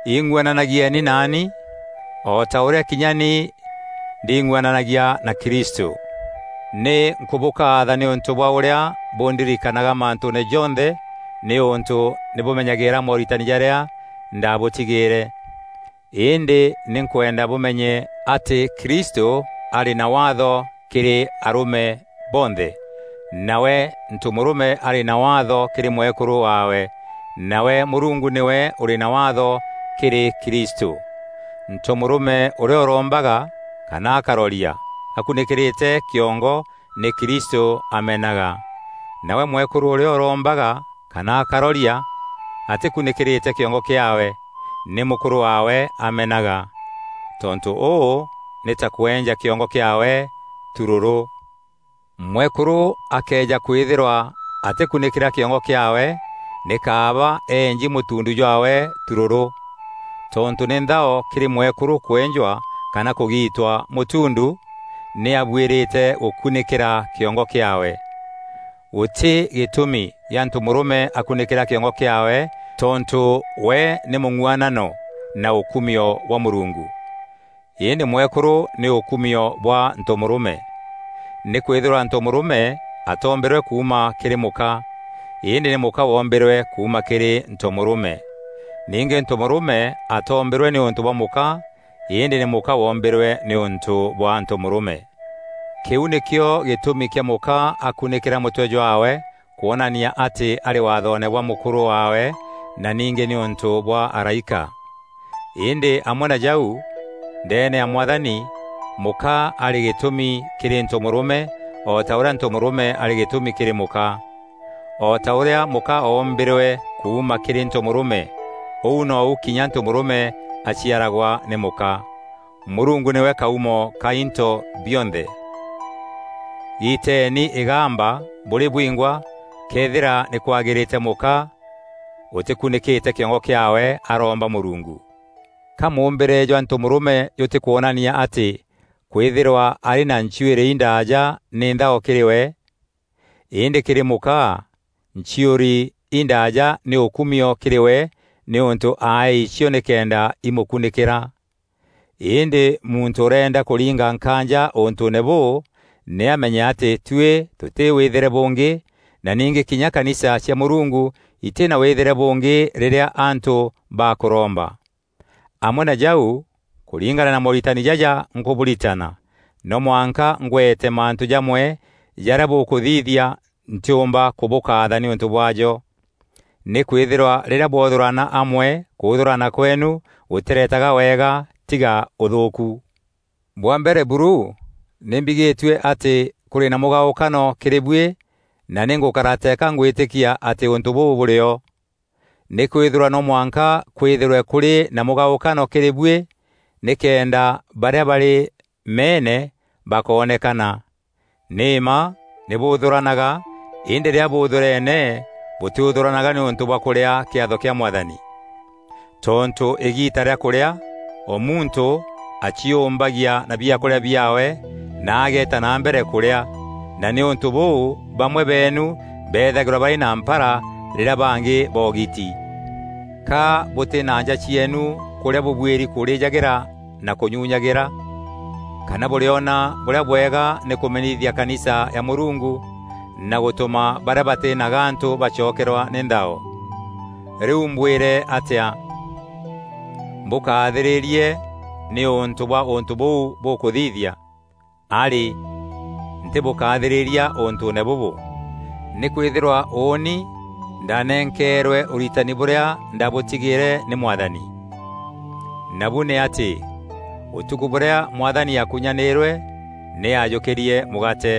Ing'uananagieni naani o ta ûrîa kinya ni nding'uananagia na Kristû. Nî nkûbûkaatha nîûntû bwa ûrîa bûndirikanaga mantûûne jonthe nîûntû nî bûmenyagîîra mooritani jarîa ndabûtigîîre. Îndî nî nkwenda bûmenye atî Kristû arî na Waatho kîrî arûme bonthe, nawe ntomûrûme arî na waatho kîrî mwekûrû waawe, nawe Mûrungu nîwe ûrî na waatho kîrî Kristû. Ntomûrûme ûrîa ûrombaga kana akaroria akunîkîrîte kîongo nî Kristû amenaga. Nawe mwekûrû ûrîa ûrombaga kana akaroria atîkunîkîrîte kîongo kîaawe nî mûkûrû waawe amenaga. Tontû ûû nî ta kwenja kîongo kîaawe turûrû. Mwekûrû akëeja kwîthîrwa atîkunîkîra kîongo kîaawe nî kaaba eenji mûtuundu jwaawe turûrû. Tontû nî nthao kîrî mwekûrû kwenjwa kana kûgiitwa mûtuundu, nî abuîrîte gûkunîkîra kîongo kîaawe. Gûtî gîtûmi gîa ntomûrûme akunîkîra kîongo kîaawe tontû we nî mûng'uanano na ûkumio bwa Mûrungu. Îndî mwekûrû nî ûkumio bwa ntomûrûme. Nîkwîthîrwa ntomûrûme atoombîrwe kuuma kîrî mûka, îndî nî mûka woombîrwe kuuma kîrî ntomûrûme. Ningî ntomûrûme atoombîrwe nîûntû bwa mûka îndî nî mûka woombîrwe nîûntû bwa ntomûrûme. Kîu nîkîo gîtûmi kîa mûka akunîkîra mûtwe jwaawe kwonania atî arî waathoone bwa mûkûrû waawe na ningî nîûntû bwa araîka. Îndî amwe na jau, ndeene ya Mwathani, mûka arî gîtûmi kîrî ntomûrûme o ta ûrîa ntomûrûme arî gîtûmi kîrî mûka. O ta ûrîa mûka oombîrwe kuuma kîrî ntomûrûme ûu nîu kinya ntomûrûme aciaragwa nî mûka. Mûrungu nîwe kaûmo ka into bionthe. Giteeni îgamba bûrî bwingwa këethîra nî kwagîrîte mûka ûtîkunîkîte kîongo kîaawe, aromba Mûrungu. Ka mûûmbîre jwa ntomûrûme jûtîkwonania atî kwîthîrwa arî na nchiûri indaaja nî nthao kîrî we? Îndî kîrî mûka nchiûri indaaja nî ûkumio kîrî we nîûntû aeei cio nîkenda imûkunîkîra. Îndî muntû ûreenda kûringa nkaanja ûntûûne bûû, nî amenye atî tuî tûtî wîthîre bûngî na ningî kinya kanisa cia Mûrungu itî na wîthîre bûngî rîrîa antû bakûromba. Amwe na jau, kûringana na mooritani jaja nkûbûritana, no mwanka ngwete mantû jamwe jarîa bûkûthithia ntîûmba kûbûkaatha nîûntû bwaajo. Nîkwîthîrwa rîrîa bwothûrana amwe kûthûrana kweenu gûtîretaga wega tiga ûthûûku. Bwa mbere buru, nî mbigîtue atî kûrî na mîgaûkano kîrî buî na nî ngûkara teeka ngwîtîkia atî ûntû bûû bûrîo. Nîkwîthîrwa no mwanka kwîthîrwe kûrî na mîgaûkano kîrî buî nîkenda barîa barî meene bakoonekana. Nî mma nî bûthûranaga îndî rîrîa bûûthûreene bûtîûthûranaga nîûntû bwa kûrîa kîatho kîa Mwathani. Tontû îgiita rîa kûrîa, o muntû aciûûmbagia na biakûrîa biaawe na ageeta na mbere kûrîa, na nîûntû bûu bamwe beenu beethagîrwa barî na mpara rîrîa bangî boogiti. Ka bûtî na nja cieenu kûrîa bûbuîrî kûrîjagîra na kûnyunyagîra? Kana bûrîona bûrîa bwega nî kûmenithia kanisa ya Mûrungu na gûtûma barîa batî na gantû bacokerwa nî nthao? Rîu mbwîre atîa? Mbûkathîrîrie nîûntû bwa ûntû bûu bûkûthithia? Arî! Ntîbûkaathîrîria ûntûûne bûbû. Nîkwîthîrwa ûûni ndanenkeerwe ûritani bûrîa ndabûtigîîre nî Mwathani. Nabu nî atî, ûtukû bûrîa Mwathani aakunyanîîrwe nî aajûkîrie mûgaate,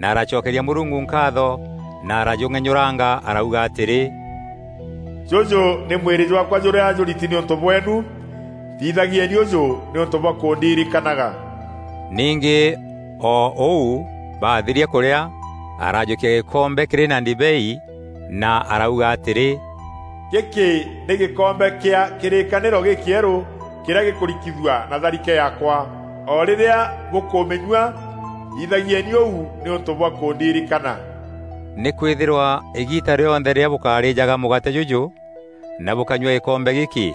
na aracokeria Mûrungu nkaatho na arajûng'enyûranga arauga atîrî, “Jûjû nî mwîrî jwaakwa jûrîa jûriti nîûntû bweenu; thithagieni ûjû nîûntû bwa kûndirikanaga.” Ningî o ûu, baathiria kûrîa, arajûkia gîkombe kîrî na ndibei na arauga atîrî, “Gîkî nî gîkombe kîa kîrîkanîro gîkîerû kîrîa gîkûrikithua na tharike yaakwa. O rîrîa bûkûmînyua, thithagieni ûu nîûntû bwa kûndirikana.” Nîkwîthîrwa îgiita rîonthe rîrîa bûkarîîjaga mûgaate jûjû na bûkanyua gîkombe gîkî,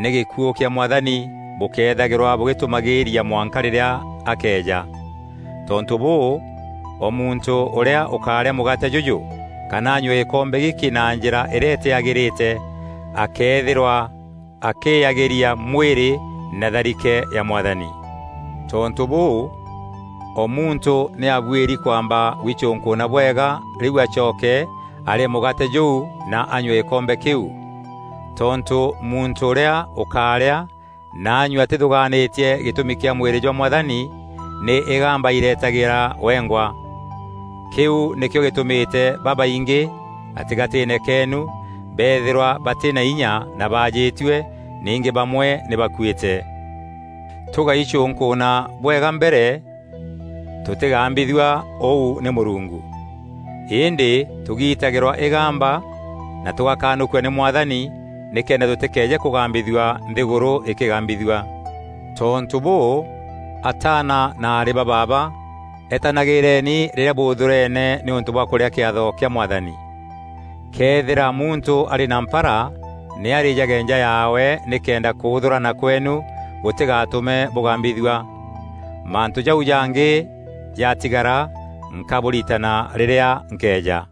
nî gîkuû kîa Mwathani bûkethagîrwa bûgîtûmagîîria mwanka rîrîa akeeja. Tontû bûû, o muntû ûrîa ûkarîa mûgaate jûjû kana anyue gîkombe gîkî na njîra îrîa îtîagîrîte akeethîrwa akîyagîria mwîrî na tharike ya Mwathani. Tontû bûû o muntû nî abuîri kwamba gwicûnkûûna bwega rîu acoke arîe mûgaate jûu na anyue gîkombe kîu. Tontû muntû ûrîa ûkaarîa na anyue atîthûgaanîtie gîtûmi kîa mwîrî jwa Mwathani, nî îgamba airetagîra wengwa. Kîu nîkîo gîtûmîte babaingî gatîgatîîne keenu beethîrwa batî na inya na baajitue, ningî bamwe nî bakuîte. Tûgäicûnkûûna bwega mbere, tûtîgambithua ûu nî Mûrungu. Îndî tûgitagîrwa îgamba na tûgakanûkua nî Mwathani, nîkenda tûtîkeeje kûgambithua nthîgûrû îkîgambithua. Tontû bûû, ataana na aarî ba baaba, etanagîîreni rîrîa bûthûreene nîûntû bwa kûrîa kîatho kîa Mwathani. Këethîra muntû arî na mpara, nî arîjage nja yaawe nîkenda kûûthûrana kweenu gûtîgatûme bûgambithua. Mantû jau jangî jatigara, nkabûritana rîrîa nkeeja.